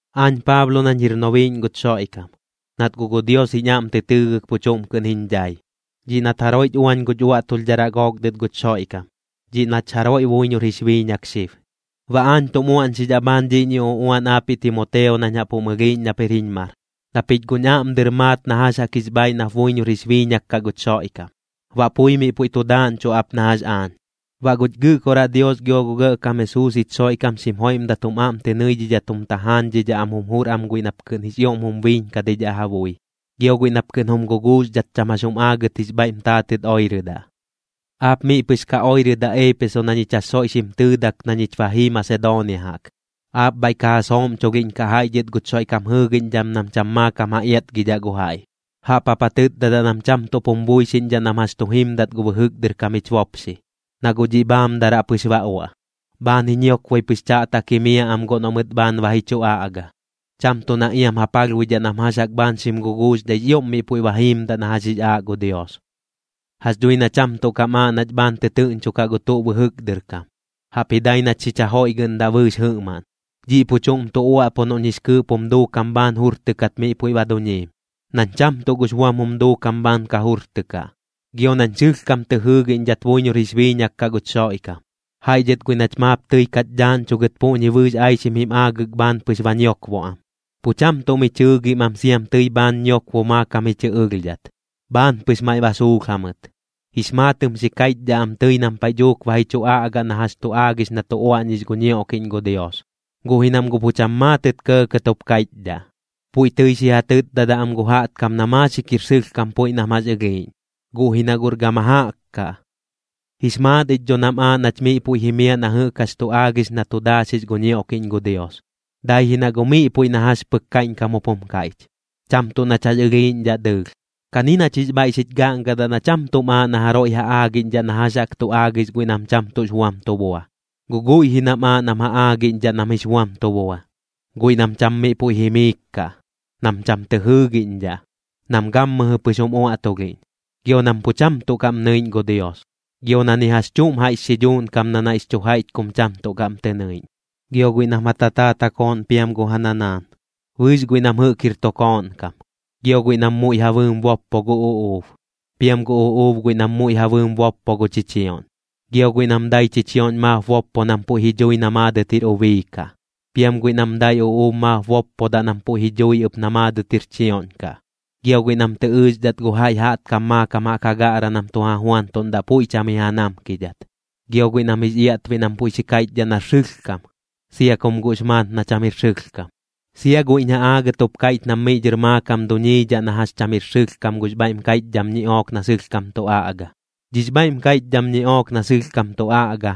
Aañ Paablo nañ jir nobiiꞌñ guch Xoiꞌkam, nat guꞌ gu Dios jiñ aꞌm tɨ tɨɨgɨk pu chuꞌm kɨꞌn jiñ dhai, dhiꞌ nat jaroiꞌch uañ guch uaꞌtulhdharaꞌ gook dɨt guch Xoiꞌkam, dhiꞌ nach jaroiꞌ buiñor jix biiñak xib. Baꞌ aañ tum uaꞌñxidhaꞌ bhaan dhiꞌñi uꞌuan aapiꞌ Timoteo nañ jaꞌp jum ɨlhiiꞌñ nap jir jiñ mar, na pich guꞌñ aꞌm dɨr maat na jax jaꞌk jix bhaaiꞌ nap buiñor jix biiñak kaꞌ guch Xoiꞌkam, baꞌ pui miꞌ puiꞌ tu daaꞌñchuꞌ ap na jax aañ. Baꞌ guch Gɨꞌkoraꞌ Dios gio gu Gɇꞌkam Jesuus jich Xoiꞌkam xim joiꞌmdat jum aꞌm tɨ nɨidhidhat jum tajaañdhidhaꞌ am jum jur am guiꞌ nap kɨꞌn jix ioꞌm jum biiñkadidhaꞌ ja bui, gio guiꞌ nap kɨꞌn jum guguuxdhat cham jax jum aagɨt jix bhaiꞌm taatɨt oirɨdaꞌ. Aap miꞌ pɨx ka oirɨdaꞌ Eepeso na ñich jax soiꞌ xim tɨɨdak na ñich ba jii Masedoonia jaꞌk. Aap bhaiꞌ ka ja sooꞌmchulhiꞌñkaꞌ jaiꞌ dhɨt guch Xoiꞌkam jɨɨgiꞌñdham nam cham maakam ja iatgidhaꞌ gu jaiꞌ. Jaꞌp jap ja tɨtdadaꞌ nam cham tuꞌp jum buixiꞌñdhaꞌ nam jax tu jimdat gu bɨjɨk dɨr kam jich bopxi, na guꞌ dhiꞌ bhaamdaraꞌ pɨx ba uaꞌ. Bhaan ji ñiokboi pɨx chaꞌtak jimiaꞌ am guꞌ noꞌ mɨt bhaan ba ji chu aꞌga, cham tuꞌ na iam ja palhbuidhaꞌ nam jax jaꞌk bhaan xim guguuxdhaix ioꞌm miꞌ puiꞌ ba jiimdaꞌ na jax jix aaꞌ gu Dios. Jax dhui na cham tuꞌ kam aaꞌ nach bhaan tɨtɨɨꞌñchokaꞌ gu tuꞌ bɨjɨk dɨr kam, jaꞌpji dai nach xich jajoiꞌgɨꞌndaꞌ bɨɨx jɨꞌmaꞌn. Dhiꞌ pu chuꞌm tu uaꞌpu noꞌñ jix kɨɨꞌp jum duukam bhaan jurtɨkat puiꞌ ba duñiim, nañ cham tuꞌ gux buam jum duukam bhaan ka jurtɨkaꞌ, gio nañ sɨlhkam tɨ jɨɨgiꞌñdhat buiñor jix biiñak kaꞌ guch Xoiꞌkam. Jaiꞌ dhɨt guiꞌ nach maap tɨi kach dhaaꞌñchugɨt puꞌñi bɨɨx aixim jim aagɨk bhaan pɨx ba ñiokbo am, pu cham tuꞌ mi chɨɨgim am siam tɨi bhaan ñiokbo maakam ji chɨ ɨlhdhat, bhaan pɨx maiꞌ ba suulh jamɨt. Jix maatɨm xi kaiꞌchdhaꞌ am tɨi nam paiꞌ dhuuk ba ji chu aꞌga na jax chu aagix na tu uaꞌñix gu ñioꞌkiꞌñ gu Dios, guꞌ ji nam guꞌ pu cham maatɨt kɇɇkɇt jup kaiꞌchdhaꞌ. Puiꞌ tɨi xi ja tɨtdadaꞌ am gu jaꞌtkam na maaxik jir sɨlhkam puiꞌ nam jax ɨlhiiꞌñ, guꞌ ji na guꞌr gama jaꞌk kaꞌ. Jix maat ich dho nam aaꞌ nach miꞌ puiꞌ jimiaꞌ na jɨꞌk jax tu aagix na tu daaxix gu ñioꞌkiꞌñ gu Dios, dai ji na guꞌ miꞌ puiꞌ na jax pɨk kaiꞌñkam jup jum kaiꞌch, cham tuꞌ nach jax ɨlhiiꞌñdhaꞌ dɨɨlh. Kani nach jix bhaiꞌ xich gaꞌngadaꞌ na cham tuꞌm aaꞌ na jaroiꞌ ja aagiꞌñdhaꞌ na jax jaꞌk tu aagix guiꞌ nam cham tuꞌx buam tu bua, guꞌ guiꞌ ji nam aaꞌ nam ja aagiꞌñdhaꞌ nam jix buam tu bua, guiꞌ nam cham miꞌ puiꞌ jimiik kaꞌ, nam cham tɨ jɨɨgiꞌñdhaꞌ, nam gammɨjɨ pɨx jum uaꞌtulhiꞌñ, gio nam pu cham tuꞌ kaꞌm nɨiꞌñ gu Dios, gio na ni jax chuꞌm jaiꞌx xidhuuꞌn kam na naiꞌx chu jaiꞌch kum cham tuꞌ kaꞌm tɨ nɨiꞌñ. Gio guiꞌ nam ja tataat ja kooꞌn piam gu ja nanaan, bɨɨx guiꞌ nam jɨꞌk jir tu kooꞌn kam. Gio guiꞌ nam muiꞌ ja bɨɨm boppo gu uꞌuub, piam gu uꞌuub guiꞌ nam muiꞌ ja bɨɨm boppo gu chichioꞌñ. Gio guiꞌ nam dai chichioꞌñ maap boppo nam puiꞌ ji dhui na maadɨt jir ubii kaꞌ, piam guiꞌ nam dai uꞌuub maap boppodaꞌ nam puiꞌ ji dhui ɨp na maadɨt jir chioꞌñ kaꞌ. Gio guiꞌ nam tɨ ɨɨxdhat gu jaiꞌ jaꞌtkam maakam jaꞌk ja gaꞌraꞌ nam tu ja juantuꞌndaꞌ puiꞌ cham ji ja namkidhat. Gio guiꞌ nam jix iaꞌtbiꞌ nam puiꞌ xi kaiꞌchdhaꞌ nar sɨlhkam, sia kum guꞌx maat na cham jir sɨlhkam. Sia guiꞌñ ja aagɨt jup kaiꞌch nam miꞌ dhɨr maakam duñiidhaꞌ na jax cham jir sɨlhkam gux bhaiꞌm kaiꞌchdham ñiꞌook na sɨlhkam tu aꞌga. Dhix bhaiꞌm kaiꞌchdham ñiꞌook na sɨlhkam tu aꞌga,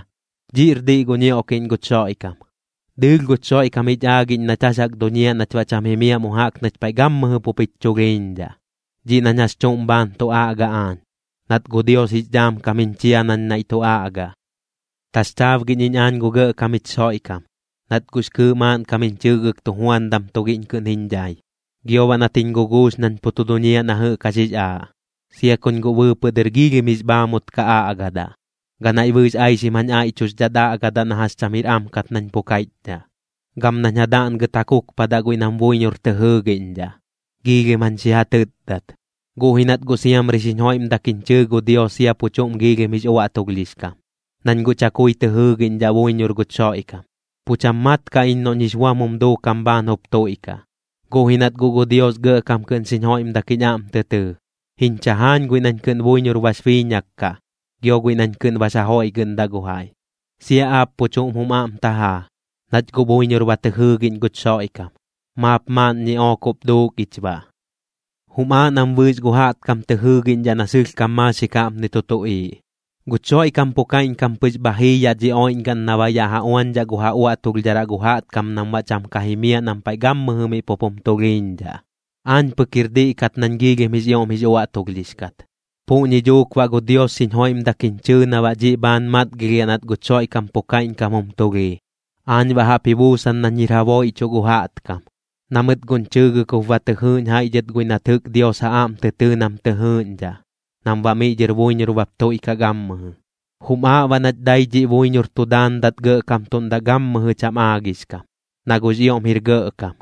dhiꞌr diꞌ gu ñioꞌkiꞌñ guch Xoiꞌkam. Dɨɨlh guch Xoiꞌkam jich aagiꞌñ nach jax jaꞌk duñiaꞌ nach baꞌ cham jimiaꞌ mu jaꞌk nach paiꞌ gammɨjɨ pup jich chulhiiñdhaꞌ, dhiꞌ nañ jax chuꞌm bhaan tu aꞌga aañ, nat gu Dios jix dhaam kam jiñ chia nañ naiꞌ tu aꞌgaꞌ. Taxchaabgiꞌñ iñ aañ gu Gɇꞌkam jich Xoiꞌkam, nat guꞌx kɨɨꞌ maaꞌnkam jiñ chɨɨgɨk tujuandam tugiꞌñ kɨꞌn jiñ dhai, gio baꞌ nat jiñ guguux nañ pu tu duñiaꞌ na jɨꞌk jax jix aaꞌ, sia kuñ guꞌ bɨɨpɨꞌ dɨr giilhim jix bhaamut ka aꞌgadaꞌ, ganaiꞌ bɨɨx aixim jañ aiꞌchuxdhat aꞌgadaꞌ na jax cham jir am kat nañ pu kaiꞌchdhaꞌ. Gam nañ ja daꞌngɨt ja kukpadaꞌ guiꞌ nam buiñor tɨ jɨɨgiꞌñdhaꞌ, giilhim jañ xi ja tɨtdat. Guꞌ ji nat guꞌ siamri xiñ joiꞌmdak jiñ chɨɨ gu Dios sia pu chuꞌm giilhim jix uaꞌtulhdhix kam, nañ guꞌ chakui tɨ jɨɨgiꞌñdhaꞌ buiñor guch Xoiꞌkam, pu cham mat kaꞌ iñ noꞌñ jix buam jum duukam bhaan jup tuiꞌkaꞌ. Guꞌ ji nat guꞌ gu Dios gɇꞌkam kɨꞌn xiñ joiꞌmdak jiñ aꞌm tɨ tɨɨ, jiñ chajaañ guiꞌ nañ kɨꞌn buiñor bax biiñak kaꞌ, gio guiꞌ nañ kɨꞌn bax jajoiꞌgɨꞌndaꞌ gu jaiꞌ. Sia aap pu chuꞌm jum aꞌm tajaa, nach guꞌ buiñor ba tɨ jɨɨgiꞌñ guch Xoiꞌkam, maap maaꞌn ñiꞌook jup duuk ich baꞌ. Jum aaꞌ nam bɨɨx gu jaꞌtkam tɨ jɨɨgiꞌñdhaꞌ na sɨlhkam maaxik jaꞌpni tu tuꞌiiꞌ: Guch Xoiꞌkam pu kaiꞌñkam pɨx bha jii yaꞌ dhi oiꞌñgaꞌn na baꞌ yaꞌ ja uañdhaꞌ gu ja uaꞌtulhdharaꞌ gu jaꞌtkam nam baꞌ cham ka jimiaꞌ nam paiꞌ gammɨjɨ miꞌ pup jum tulhiiñdhaꞌ. Aañ pɨk jir diꞌ kat nañ giilhim jix ioꞌm jix uaꞌtulhdhix kat. Puꞌñi dhuuk baꞌ gu Dios xiñ joiꞌmdak jiñ chɨɨ na baꞌ dhiꞌ bhaan matgilhiaꞌ nat guch Xoiꞌkam pu kaiꞌñkam jum tulhii. Aañ baꞌ jaꞌp ji buusan nañ jir ja booiꞌchuꞌ gu jaꞌtkam, na mɨt guꞌñ chɨɨgɨk jup ba tɨ jɨɨꞌñ jaiꞌ dhɨt guiꞌ nat jɨꞌk Dios ja aꞌm tɨ tɨɨ nam tɨ jɨɨꞌñdhaꞌ, nam baꞌ miꞌ dhɨr buiñor bap tuiꞌkaꞌ gammɨjɨ. Jum aaꞌ baꞌ nach dai dhiꞌ buiñor tu daandat gɇꞌkamtuꞌndaꞌ gammɨjɨ cham aagix kam, na guꞌx ioꞌm jir gɇꞌkam,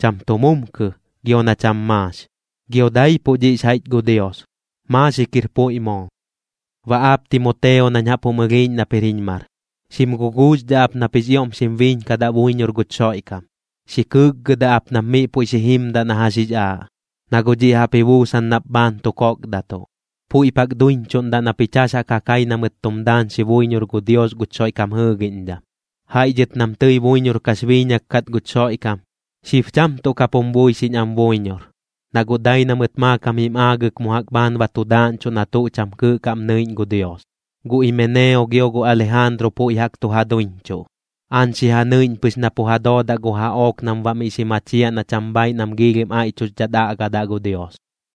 cham tu mumkɨ, gio na cham maax. Gio daipuꞌ dhiꞌx jaiꞌch gu Dios. Maaxik jir puiꞌ moo. Baꞌ aap Timoteo nañ jaꞌp jum ɨlhiiꞌñ nap jir jiñ mar, xim guguuxdhaꞌ ap nap jix ioꞌm xim biiñkadaꞌ buiñor guch Xoiꞌkam. Xi kɨɨkgɨdaꞌ ap nap miꞌ puiꞌ xi jimdaꞌ na jax jix aaꞌ, na guꞌ dhiꞌ jaꞌp ji buusan nap bhaan tu kokdatuꞌ. Puiꞌp jaꞌk duiñchuꞌndaꞌ na pich jax jaꞌk ja kai na mɨt tum daañxi buiñor gu Dios guch Xoiꞌkam jɨɨgiꞌñdham. Jaiꞌ dhɨt nam tɨi buiñor kax biiñak kat guch Xoiꞌkam, xib cham tuꞌ kap jum buixiꞌñ am buiñor, na guꞌ dai na mɨt maakam jim aagɨk mu jaꞌk bhaan ba tu daaꞌñchuꞌ na tuꞌ cham kɨɨꞌ kaꞌm nɨiꞌñ gu Dios. Gu Imeneo gio gu Alijaanru puiꞌ jaꞌk tu ja duiñchuꞌ. Aañ xi ja nɨiꞌñ pɨx na pu ja doodaꞌ gu jaꞌook nam baꞌ miꞌ xi machiaꞌ na cham bhaiꞌ nam giilhim aiꞌchuxdhat aꞌgadaꞌ gu Dios.